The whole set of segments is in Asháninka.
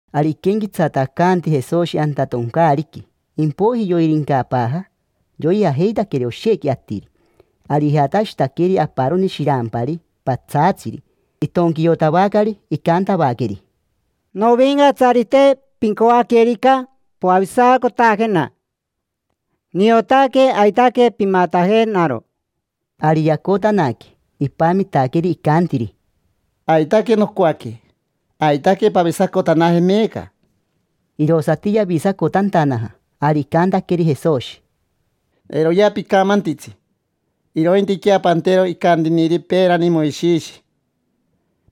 Ari iquenquetsatacanti Jesoshi anta toncaariqui, impoiji yoirincapaaja, yoijajeitaqueri oshequi atiri. Ari ijatashitaqueri aparoni shirampari patsaatsiri, itonquiotavacari, icantavaqueri: —Novincatsarite, pincoaquerica poavisacotajena, niotaque aitaque pimatajenaro. Ari yacotanaque, ipamitaqueri, icantiri: —Aitaque nocoaque. Aitaque pavisacotanaje meeca. Irosati yavisacotantanaja. Ari icantaqueri Jesoshi: —Eiroya picamantitsi, irointiquea pantero icantiniri peerani Moishishi: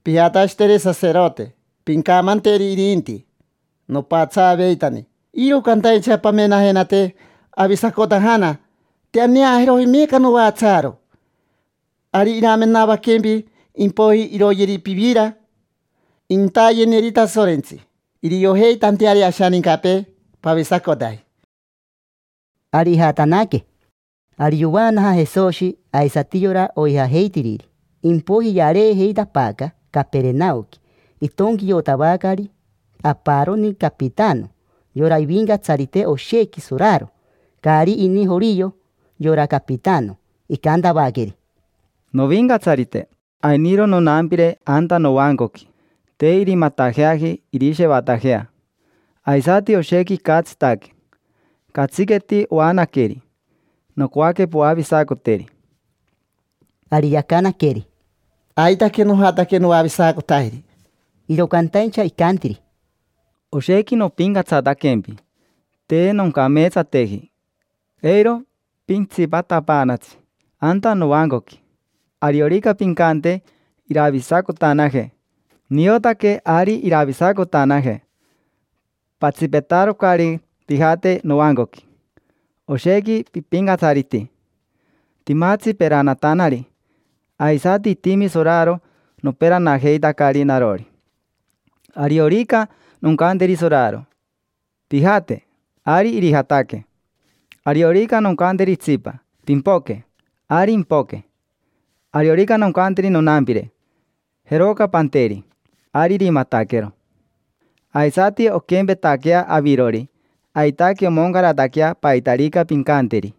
pijatashiteri saserote, pincamanteri irinti: “Nopatsaaveitani, iro cantaincha pamenajenate, avisacotajana: te aneajeroji meeca novatsaaro”. Ari iramenavaquempi, impoiji iroyeri pivira, intayeneri Tasorentsi, iriojeitanteari ashanincapee pavisacotaji. Ari ijatanaque. Ari yovaanaja Jesoshi, aisati yora oijajeitiriri, impoiji yareejeitapaaca Caperenaoqui. Itonquiotavacari aparoni capitano, yora ivincatsarite oshequi soraro. Caari ini jorio yora capitano. Icantavaqueri: —Novincatsarite, ainiro nonampire anta novancoqui, te irimatajeaji irishevatajea, aisati oshequi icatsitaque. Catsiqueti oanaqueri. Nocoaque poavisacoteri. Ari yacanaqueri: —Aitaque nojataque noavisacotajeri. Iro cantaincha icantiri: —Oshequi nopincatsataquempi: te noncameetsateji, eiro pintsipatapaanatsi anta novancoqui. Ariorica pincante iravisacotanaje, niotaque ari iravisacotanaje: patsipetarocari pijate novancoqui. Oshequi pipincatsariti. Timatsi peranatanari, aisati itimi soraro noperanajeitacari narori. Ariorica noncanteri soraro: “Pijate”, ari irijataque. Ariorica noncanteri itsipa: “Pimpoque”, ari impoque. Ariorica noncanteri nonampire: “Jeroca panteri”, ari irimataquero. Aisati onquempetaquea avirori, aitaque omoncarataquea paitarica pincanteri.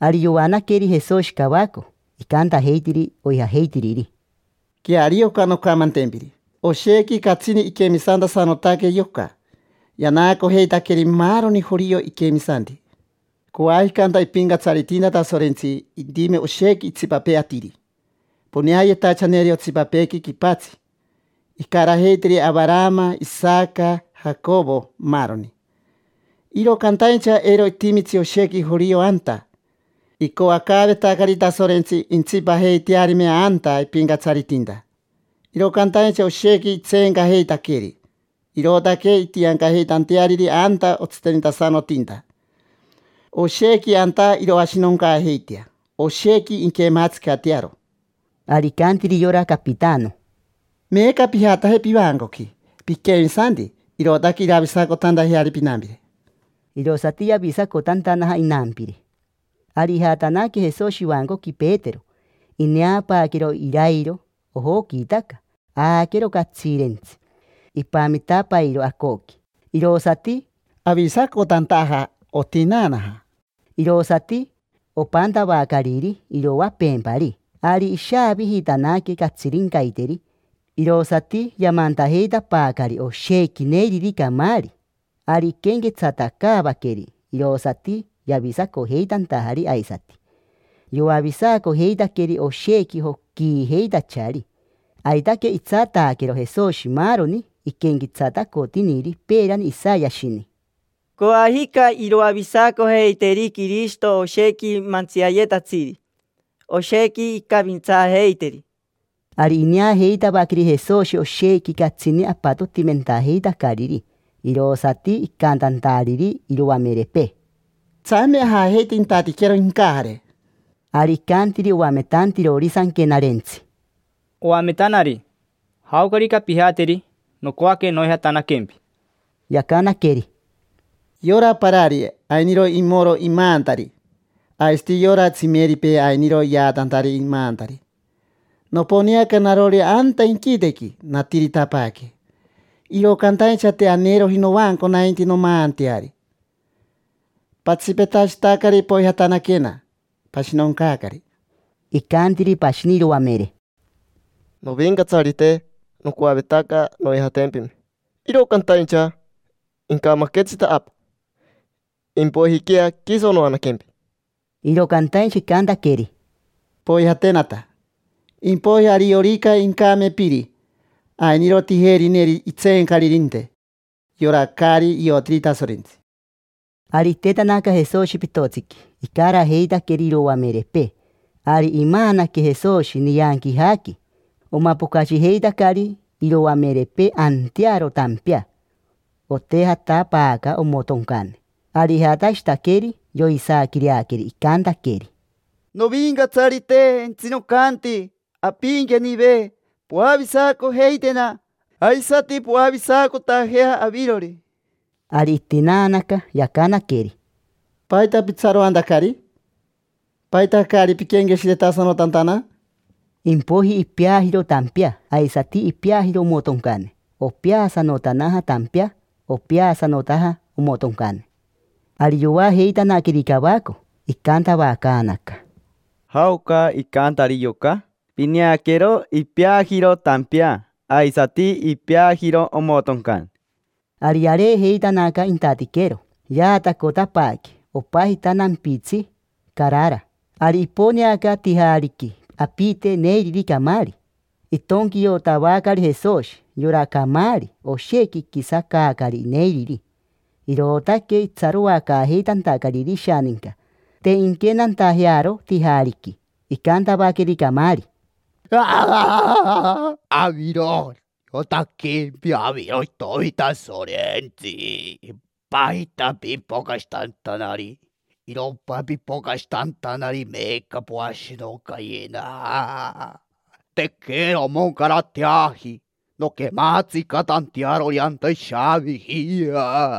Ari yoanaqueri Jesoshi cavaco, icantajeitiri oijajeitiriri: —Queario oca noncamantempiri: oshequi catsini iquemisantasanotaque yoca, yanaacojeitaqueri maaroni jorio iquemisanti. Coajica anta ipincatsaritinta Tasorentsi intime oshequi itsipapee atiri poneayetachaneri otsipapeequi quipatsi. Incarajeiteri Avarama, Isaca, Jacovo, maaroni. Iro cantaincha eiro itimitsi oshequi jorio anta. Icoacaavetacari Tasorentsi intsipajeitearime anta ipincatsaritinta, iro cantaincha oshequi itseencajeitaqueri, irootaque intiancajeitanteariri anta otsitenitasanotinta. Oshequi anta iroashinoncaajeitea, oshequi inquematsicatearo. Ari icantiri yora capitano: —Meeca pijataje pivancoqui. Piquemisanti, irootaque iravisacotantajeari pinampire. Irosati yavisacotantanaja inampire. Ari ijatanaque Jesoshi ivancoqui Petero. Ineapaaquero irairo, ojoquiitaca, aaquero catsiirentsi. Ipamitapairo acoqui, irosati avisacotantaja. Otinaanaja, irosati opantavacariri iroapeempari. Ari ishaavijiitanaque catsirincaiteri, irosati yamantajeitapaacari oshequi neiriri camaari. Ari iquenquetsatacaavaqueri, irosati yavisacojeitantajari. Aisati yoavisacojeitaqueri oshequi joquiijeitachari. Aitaque itsataaquero Jesoshi maaroni iquenquetsatacotiniri peerani Isayashini: “Coajica iroavisacojeiteri Quirishito oshequi mantsiayetatsiri, oshequi incavintsaajeiteri”. Ari ineajeitavaqueri Jesoshi oshequi catsini apatotimentajeitacariri, irosati icantantariri iroamerepee: —Tsame ajajeite intatiquero incajare. Ari icantiri oametantirori Sanquenarentsi: —Oametanari, jaocarica pijateri, nocoaque noijatanaquempi. Yacanaqueri: —Yorari parari ainiro imoro imaantari, aisati yora tsimeripee ainiro yaatantari imaantari. Noponeaca narori anta inquitequi, natiritapaaque, iro cantaincha te aneroji novanco nainti nomaanteari. Patsipetashitacari poijatanaquena, pashinoncaacari. Icantiri pashini iroamere: —Novincatsarite, nocoavetaca noijatempime, iro cantaincha incamaquetsita apa: impoijiquea quiso noanaquempi. Iro cantaincha icantaqueri: —Poijatenata, impoiji ariorica incame piri, ainiro tijerineri itseencaririnte: yora caari iotiri Tasorentsi. Ari itetanaca Jesoshi pitotsiqui, icarajeitaqueri iroamerepee. Ari imaanaque Jesoshi. Nianquijaqui omapocashijeitacari iroamerepee antearo tampea, otejatapaaca omotoncane. Ari ijatashitaqueri, yoisaaquireaqueri, icantaqueri: —Novincatsarite, jentsinocanti ampiinquenive: poavisacojeitena, aisati poavisacotajea avirori. Ari itinaanaca, yacanaqueri: —¿Paita pitsaroantacari? ¿Paita caari piquenqueshiretasanotantana? Impoiji ipeajiro tampea, aisati ipeajiro omotoncane. Opeasanotanaja tampea, opeasanotaja omotoncane. Ari yoajeitanaqueri cavaco, icantavacaanaca: —¿Jaoca icantari yoca? Pineaquero ipeajiro tampea, aisati ipeajiro omotoncane, maa. Ari yareejeitanaca intatiquero, yaatacotapaaque. Opajita nampitsi Carara. Ari iponeaca tijaariqui apite neiriri camaari, itonquiotavacari Jesoshi. Yora camaari, oshequi iquisacaacari neiriri, irootaque itsaroacaajeitantacariri ishaninca, te inquenantajearo tijaariqui. Icantavaqueri camaari: —¿Aviro? Niotaquempi, aviro Itomi Tasorentsi. ¿Paita pipocashitantanari? ¿Irompa pipocashitantanari meeca poashinoncayena? Tequera omoncarateaji nonquematsicatantearori anta ishaaviji.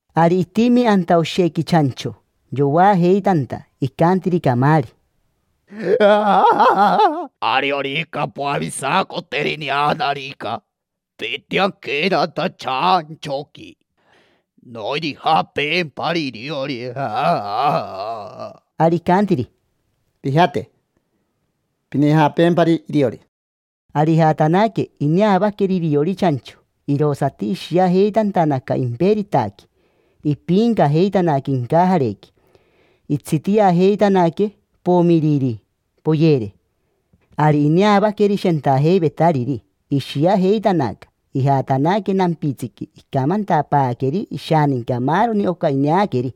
Ari itimi anta oshequi chancho, yoajeitanta. Icantiri camaari: —Ariorica poavisacoteri neanarica, pintianquena anta chanchoqui, nonijapeempari iriori. Ari icantiri: —Pijate, pinijapeempari iriori. Ari ijatanaque, ineavaqueri iriori chancho, irosati ishiajeitantanaca imperitaqui, ipiincajeitanaque incajarequi, tsapo, tsapo, tsapo, tsapo. Itsitiajeitanaque, pomiririri, poyere. Ari ineavaqueri shentajeivetariri, ishiajeitanaca. Ijatanaque nampitsiqui, icamantapaaqueri ishaninca maaroni oca ineaqueri.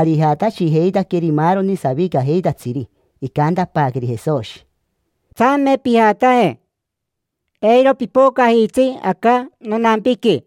Ari ijatashijeitaqueri maaroni savicajeitatsiri, icantapaaqueri Jesoshi: —Tsame pijataje: eiro pipocajitsi aca nonampiqui.